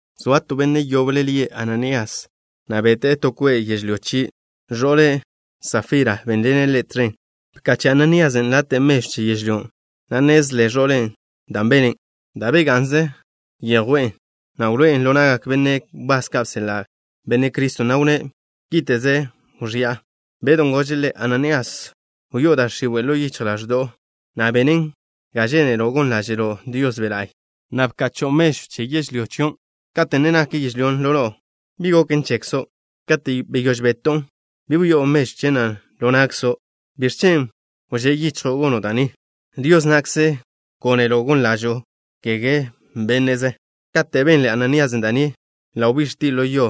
Zoa to benne' yoble lie' Ananías, na' bete'e to kwe' yežlyó chie'. Ẕo'le', Safira, bénḻene' ḻe' tẕen. Bkache' Ananíasen' late' mežw che yežlyón', na' nnezle ẕo'le' dan' bene'. Da' bega'nzen yjwen', na' wloé'en ḻo na'gak benne' wbás ka' bseḻa' Benne' Criston', na' wnné': —Kíte'ze wẕi'a. Bedw gože' ḻe': —Ananías, ¿wyó'o da' x̱iwe' ḻo yichj ḻaẕdo'o, na' benen ga žénelo' gon ḻáže'lo' Dios Be' La'y, na' bkacho'o che mežw che yežlyó chion'? Katen' bga'n yežlyón' ḻo no'o, ¿bi goken chekzo'? Kate' beyóž beto'on, ¿bi wyó'o mežwn' ḻo na'kzo'? ¿Biẕ chen' wžé' yichjo' gono' da' ni? Dios na'kze gónelo' gon ḻáže'lo', kege bénne'ze. Kate' benle Ananíasen' da' ni, ḻa' wbíx̱tie' ḻo yo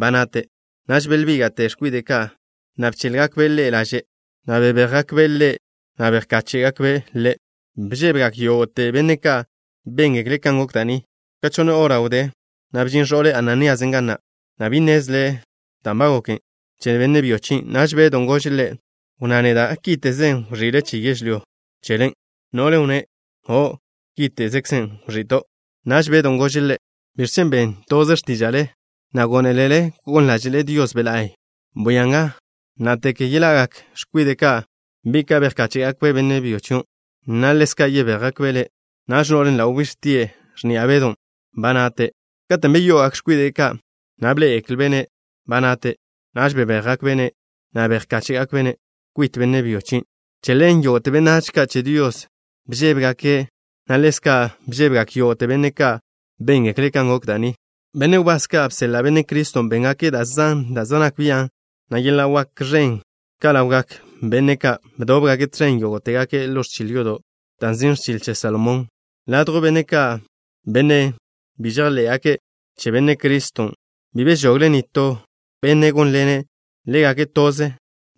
ba nate'. Naž belbíga'te x̱kwide' ka', na' bchéḻgakbe' ḻe' laže', na' bebéjgakbe' ḻe', na' bejkáche'gakbe' ḻe'. Bžébegak yógo'te benne' ka' béngekle' kan gok da' ni. Ka chonne hora wdé na', bžin ẕo'le Ananíasen' ga na', na' bi nnezle' dan' goken che benne' byo chien'. Naž Bedon' gože' ḻe': —Wnná neda'. ¿Kíte'ze wẕi'le che yežlyó chelen'? No'len' wnné': —O', kíte'ze wẕi'to'. Naž Bedon' gože' ḻe': —¿Biẕ chen' ben toze x̱tíža'le, na' gónelele gon ḻáže'le Dios Be' la'y? Bwia nga. Ná'tege yeḻa'gak x̱kwide' ka', bi' ka' bejkáche'gakbe' benne' byo chion', na' ḻezka' yebéjgakbe' le'. Naž no'len' ḻa' wbíx̱tie' x̱ni'a Bedon', ba nate'. Katen' beyo'ogak x̱kwide' ka', na' bḻé'egeklbe'-ne' ba nate'. Naž bebéjgakbe'-ne', na' bejkáche'gakbe'-ne' kwit benne' byo chien'. Che ḻen yógo'te benách ka' che Dios bžébegake', na' ḻezka' bžébegak yógo'te benne' ka' béngekle' kan gok da' ni. Benne' wbás ka' bseḻa' Benne' Criston' béngake' da' zan da' zej nak bian', na' yeḻa' wak ẕen ka' ḻawgak benne' ka'. Bdóbgake' tẕen yógo'tegake' ḻo ẕchil yodo' da' nzin' Ẕchil Che Salomón. Ladjw benne' ka', benne' bi žejḻé'gake' che Benne' Criston', bi bežogle nitó benne' gónḻene' ḻégake' toze,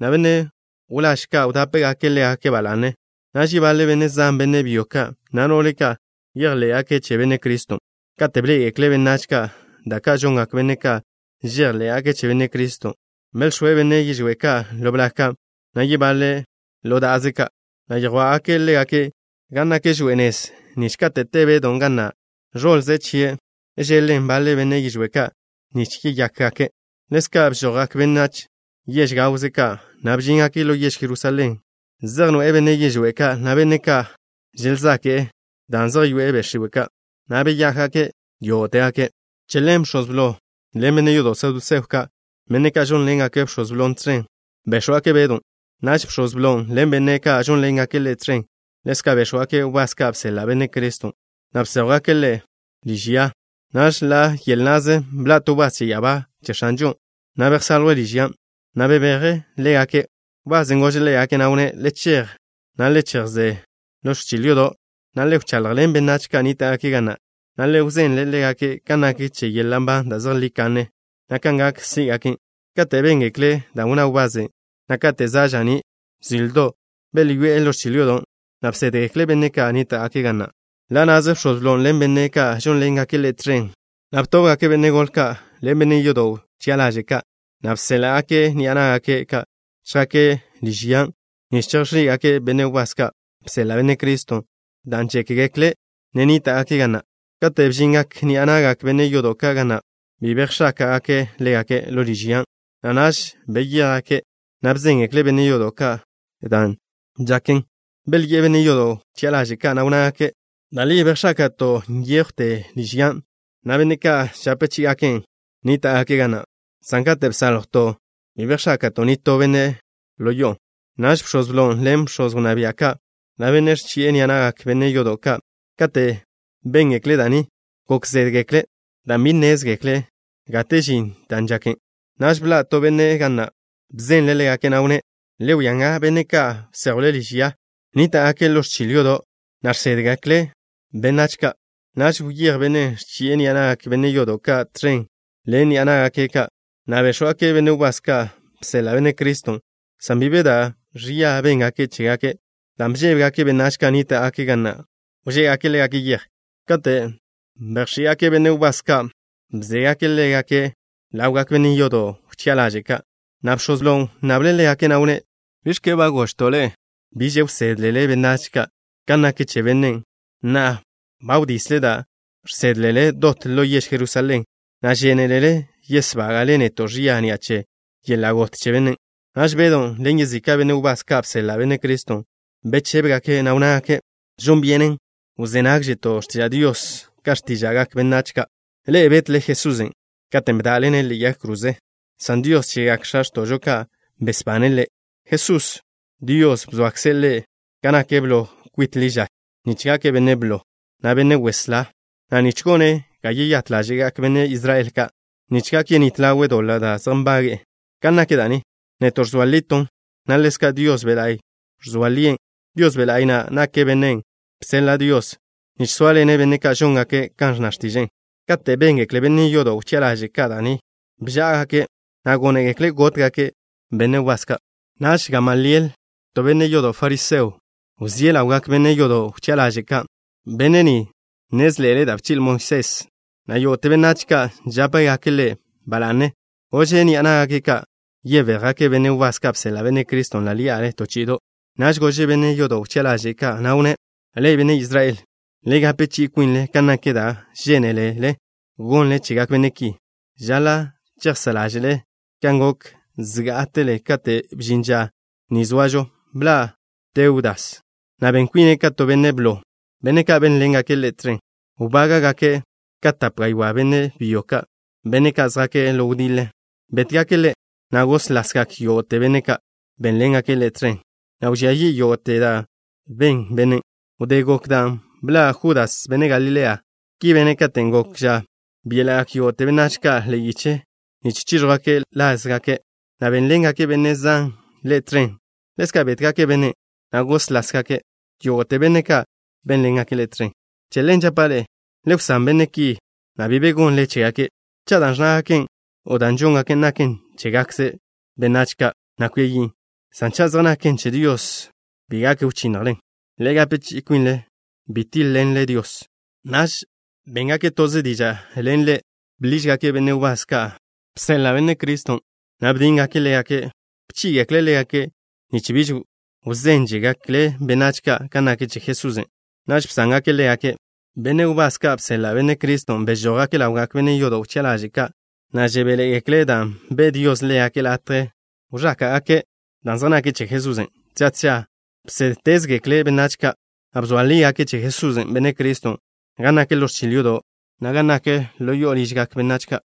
na' benne' wláž ka' wdápegake' ḻégake' ba la'ne. Naž yebaḻe benne' zan, benne' byo ka', na' no'le ka', bejḻé'gake' che Benne' Criston'. Kate' bḻé'egekle benách ka' da' ka' žongak benne' ka' žejḻé'gake' che Benne' Criston', belx̱óe' benne' yižwé' ka' ḻo blag ka', na' yebaḻe' ḻo da'aze ka', na' yjwá'gake' ḻégake' gan nak kwit nez nich kate' te Bedon' ga na', ẕoḻze chie' cheḻen baḻe benne' yižwé' ka', nich yeyákgake'. Ḻezka' bžojgak benách yež gawze ka', na' bžíngake' ḻo yež Jerusalén, zej noe'e benne' yižwé' ka', na' benne' ka' želzake'e dan' zej yoe'e be' x̱iwe' ka', na' beyákgake' yógo'tegake'. Che ḻen bx̱oz blo ḻen benne' yodo' saduseo ka', benne' ka' žónḻengake' bx̱oz blon' tẕen, béx̱wgake' Bedw. Naž bx̱oz blon' ḻen benne' ka' žónḻengake' ḻe' tẕen, ḻezka' béx̱wgake' wbás ka' bseḻa' Benne' Criston', na' bséjwgake' ḻégake' liž ya. Naž ḻa' yel na'ze bḻa' to wbás che ya'abá che X̱anžon', na' bsaljwe' liž yan', na' bebeje' ḻégake'. Wbasen' gože' ḻégake', na' wnné': —Le chej, na' le chejsé ḻo ẕchil yodo', na' le wchaḻjḻen benách ka' nníta'gake' ga na', na' le wzenle ḻégake' kan nak che yeḻa' nban da' zejlí kanne, na' kan gak sí'gaken'. Kate' béngekle' da' wnná wbasen', na' kate' za' ža'ní' zildo', belyoé'e ḻo ẕchil yodo', na' bsédgekle' benne' ka' nníta'gake' ga na'. Ḻa' na'ze bx̱oz blon' ḻen benne' ka' žónḻengake' ḻe' tẕen bdóbgake'. Btóbgake' benne' gole ka' ḻen benne' yodo' wchi'a ḻaže' ka', na' bséḻa'gake' ni'a ná'gake' ka' chjake' liž yan', nich chejx̱í'gake' benne' wbás ka' bseḻa' Benne' Criston', dan' žékgekle' ne nníta'gake' ga na'. Kate' bžingak ni'a na'gak benne' yodo' ka' ga na', bi bejx̱áka'gake' ḻégake' ḻo liž yan', na' naž beyéjgake', na' bzéngekle' benne' yodo' ka' da' žaken. Belyi'e benne' yodo' wchi'a ḻaže' ka', na' wnnágake': —Da' li bejx̱áka'to' nyéjwte liž yan', na' benne' ka' žape chí'igaken' wnníta'gake' ga na', san kate' bsáljwton', bi bejx̱áka'to' nitó benne' ḻo yo'on'. Naž bx̱oz blon' ḻen bx̱oz wnná bia' ka', na' bennen' ẕchi'e ni'a na'gak benne' yodo' ka', kate' béngekle' da' ni, gok zédgekle' dan' bi nnézgekle' gate žin da' žaken. Naž bḻa' to benne' ga na'. Bzenle' ḻégake', na' wnné': —Le wia nga. Benne' ka' bséjwle liž ya nníta'gake' ḻo ẕchil yodo', na' žsédgekle' benách ka'. Naž wyéj bennen' ẕchi'e ni'a na'gak benne' yodo' ka' tẕen ḻen ni'a ná'gake' ka', na' béx̱wgake' benne' wbás ka' bseḻa' Benne' Criston', san bi be da' ẕia béngake' chégake', dan' bžébegake' benách ka' nníta'gake' ga na' wžé'egake' ḻégake' yej. Kate' ba bedjché'gake' benne' wbás ka', bzégake' ḻégake' ḻawgak benne' yodo' wchi'a ḻaže' ka', na' bx̱oz blon' wnnable' ḻégake', na' wnné': —¿Bi bchi'leto' ḻe'e biž wsédlele benách ka' kan nak che bennen'? Na'a, ba wdisle da' žsédlele dot ḻo yež Jerusalén, na' žénelele yesbága'le neto' ẕia ni'a che yeḻa' got che bennen'. Naž Bedon' ḻen yezika' benne' wbás ka' bseḻa' Benne' Criston', bechébegake', na' wnnágake': —Žon byenen wzé nágžeto' x̱tiža' Dios ka x̱tíža'gak benách ka'. Ḻe'e betle Jesusen' katen' bda'le-ne' ḻe'e yag kroze, san Dios chegak x̱a x̱to'žo ka' besbane' Ḻe'. Jesusen', Dios bzoakze' Ḻe' gan nak blo kwitkze' ḻi ža, nich gake' Benne' Blo, na' Benne' Weslá, na' nich gone' ga yeyát ḻáže'gak benne' Israel ka', nich gak yenít ḻawe' doḻa' da' zej nbage'e. Kan nak da' ni, neto' ẕzoa liton', na' ḻezka' Dios Be' La'y ẕzoa lien'. Dios Be' La'y na' nake' Bennen' žseḻa' Dios nich sóaḻene' benne' ka' žóngake' kan ẕnna x̱tiže'e. Kate' béngekle benne' yodo' wchi'a ḻaže' ka' da' ni, bžá'agake', na' gónegekle' gótgake' benne' wbás ka'. Naž Gamaliel, to benne' yodo' fariseo, wzíe' ḻawgak benne' yodo' wchi'a ḻaže' ka'. Benne' ni žákḻi'e da' bchi'le Moisés, na' yógo'te benách ka' žápegake' ḻe' ba la'ne. Gože' ni'a ná'gake' ka' yebéjgake' benne' wbás ka' bseḻa' Benne' Criston' ḻí'ale to chi'ido'. Naž gože' benne' yodo' wchi'a ḻaže' ka', na' wnné': —Ḻe'e, benne' Israel ka', le gape chi'i kwinle kan nak da' žénelele gonle chegak benne' ki. Žaḻa' chejsá' ḻáže'le kan gok zgá'atele kate' bžin ža ni zoažo. Bḻa' Teudas, na' ben kwine' ka to benne' blo. Benne' ka' bénḻengake' ḻe' tẕen wbábgake' ka tape gaywá' benne' byo ka'. Benne' ka' žjake' ḻo wdiḻe bétgake' ḻe', na' góslasgak yógo'te benne' ka' bénḻengake' ḻe' tẕen, na' wẕía yi' yógo'te da' ben bennen'. Wdé gok dan', bḻa' Judas, benne' Galilea. Ki bene' katen' gok ža byéla'gak yógo'te benách ka' ḻe'e yiche nich chíẕjwgake' lázgake', na' bénḻengak benne' zan ḻe' tẕen. Ḻezka' bétgake' bennen', na' góslasgak yógo'te benne' ka' bénḻengake' ḻe' tẕen. Che ḻen žapa' ḻe'e: le wsán benne' ki, na' bi be gonle chégake'. Cha' dan' ẕnnágake' o dan' žóngake' naken chégakze benách ka', na' kwia yin', san cha' zej naken che Dios, bi gak wchinnjlen. ¡Le gape chi'i kwinle bi tíḻ-ḻenle Dios! Naž béngake' toze diža' ḻen ḻe'. Bḻížgake' benne' wbás ka' bseḻa' Benne' Criston', na' bdíngake' ḻégake'. Bchí'igekle' ḻégake' nich bi wzénžegekle' benách ka' kan nak che Jesusen'. Naž bsángake' ḻégake'. Benne' wbás ka' bseḻa' Benne' Criston' bžójgake' ḻawgak benne' yodo' wchi'a ḻaže' ka', na' žebéḻe'egekle' dan' be' Dios ḻégake' latje wẕáka'gake' dan' zej nake' che Jesusen'. Tža tža bsédtezgekle' benách ka', na' bzoa lígake' che Jesús, Benne' Criston', gan nak ḻo ẕchil yodo', na' gan nak ḻo ližgak benách ka'.